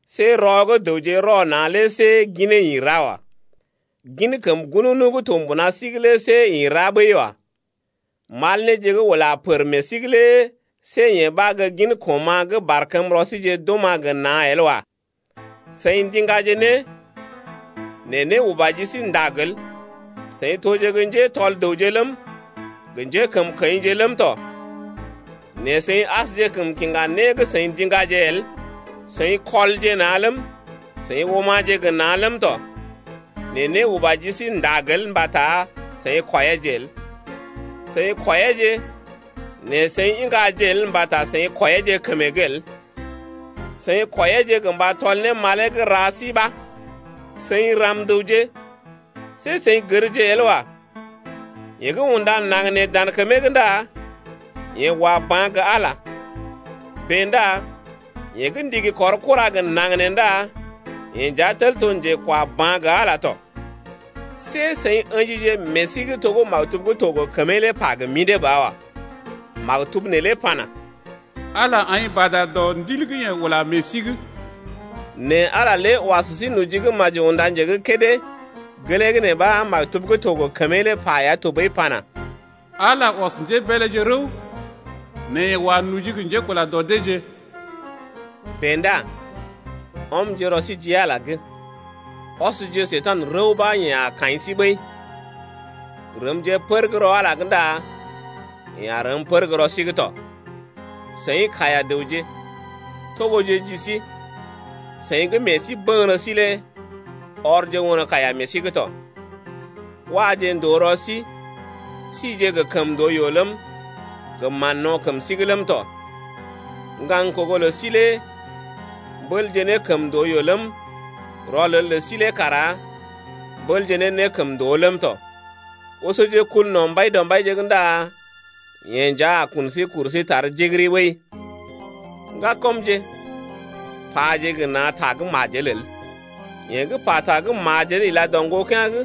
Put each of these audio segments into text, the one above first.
See rɔ gə́ dəwje rɔ na̰ lé see ginee ḭ ra wa. Gin kəm ŋgununu gə́ to mbuna sí’g lé see ḭ ra ɓəi wa. Mal néje gə́ ula pər meḛ sí’g lé see yee ɓa gə́ gin koma̰ gə́ barkəmrɔ síje d’oma̰ gə na̰ el wa. Seḭ ndiŋgaje né, nɛ né uba ji sí ndag el. Seḭ toje gə́ njétɔl dəwje ləm, gə njékəmkəḭje ləm tɔ, nɛ seḭ asjekəm kiŋga né gə́ seḭ ndiŋgaje el. Seḭ kɔlje na̰ ləm, seḭ oma̰je gə́ na̰ ləm tɔ, nɛ né uba ji sí ndag el mbata seḭ kwɔiyeeje el. Seḭ kwɔiyeeje nɛ seḭ iŋgaje el mbata seḭ kwɔiyeeje kəmee’g el, seḭ kwɔiyeeje gə mba tɔl ne malee gə́ ra sí ɓa. Seḭ ram-dəwje, see seḭ gərje el wa. Yeḛ gə́ unda naŋg nee dan kəmee’g ndá yeḛ wa ba̰ gə Ala. Bèe ndá yeḛ gə́ ndigi kɔr kura gə naŋg nee ndá yeḛ nja tel to njekwaba̰ gə Ala tɔ. See seḭ ə̰jije meḛ sí’g to gə́ maktub gə́ to gə kəmee lé pa gə mḭdé ba wa. Maktub neelé pana: Ala aḭ bada dɔ Ndil gə́ yeḛ ula meḛ sí’g. Nɛ Ala lé wa sə sí noji gə́ maji unda nje gə́ kédé, gelee gə́ nee ɓa maktub gə́ to gə kəmee lé pa ya tɔɓəi pana: Ala ɔs njébeeleje rəw nɛ yeḛ wa noji gə njékula dɔ deeje. Bèe ndá ɔmje rɔ sí ji Ala’g. Ɔsje Njekurai rəw ɓa yeḛ a kaḭ sí ɓəi. Rəmje pər gə́ rɔ Ala’g ndá yeḛ a rəm pər gə́ rɔ sí’g tɔ. Seḭ kaiya-dəwje, togoje ji sí, seḭ gə́ meḛ sí bəŋgərə sí lé ɔrje won kaiya meḛ sí’g tɔ. Waje ndòo rɔ sí, síje gə kəmndooyoo ləm, gə mán-no̰ kəm sí’g ləm tɔ. Ŋgaŋ kogo lə sí lé mbélje ne kəmndooyoo ləm, rɔlel lə sí lé kara mbélje ne nékəmndoo ləm tɔ. Osoje kul no̰ Mbaidɔmbaije’g ndá yeḛ nja a kun sí kuru sí tar jigiri ɓəi. Ŋgakɔmje, paje gə na̰ ta gə́ majel el. Yeḛ gə́ pata gə́ majel ila dɔ ŋgokea̰’g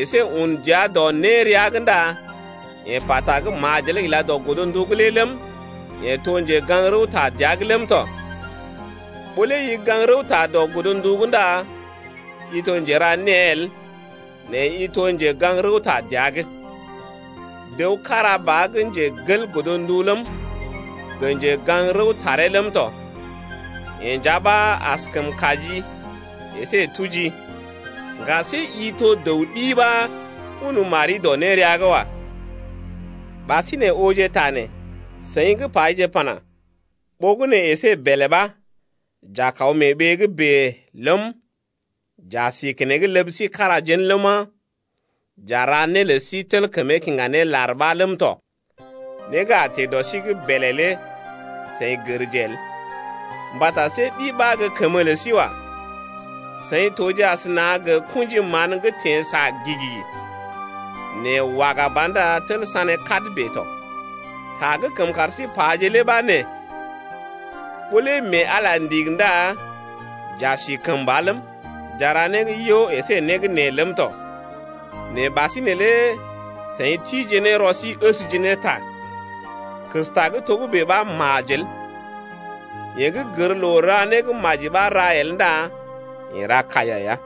əsé un dəa dɔ nérea’g ndá yeḛ pata gə́ majel ila dɔ godndu’g lé ləm, yeḛ to njegaŋ-rəwta dəa’g ləm tɔ. Ɓó lé i gaŋg rəwta dɔ godndu’g ndá i to njera née el nɛ i to njegaŋ-rəwta dəa’g. Dəw kára ba gə́ njegel godndu ləm, gə njegaŋ-rəwtaree ləm tɔ. Yeḛ nja ɓa askəm kajii əsé tujii. Ŋga see i to dəw ɗi ɓa un mari dɔ nérea’g wa. Ɓasinè ooje ta nee: Seḭ gə́ paje pana: Ɓogənè əsé bèlè ɓa, j’a kaw mee ɓee gə́ bèe ləm, j’a si keneŋ ləb sí kára jén ləma, j’a ra né lə sí tel kəmee kiŋga ne lar ɓa ləm tɔ. Né gə́ a teḛ dɔ sí’g bèlè lé seḭ gərje el! Mbata see ɗi ɓa gə́ kəmə lə sí wa. Seḭ toje asəna gə kṵji mán gə́ teḛ sa gi-gi, nɛ waga ba ndá tel sané kad bèe tɔ. Ta gə́ kəm kar sí paje lé ɓa nee: Ɓó lé mee Ala ndigi ndá j’a si kəmba ləm, j’a ra né gə́ yo əsé né gə́ nee ləm tɔ. Nɛ ɓasinè lé seḭ tije ne rɔ sí əsje ne ta. Kesta gə́ togə́bè ɓa majel. Yeḛ gə́ gər ra né gə́ maji ɓa ra el ndá yeḛ ra kaiya ya.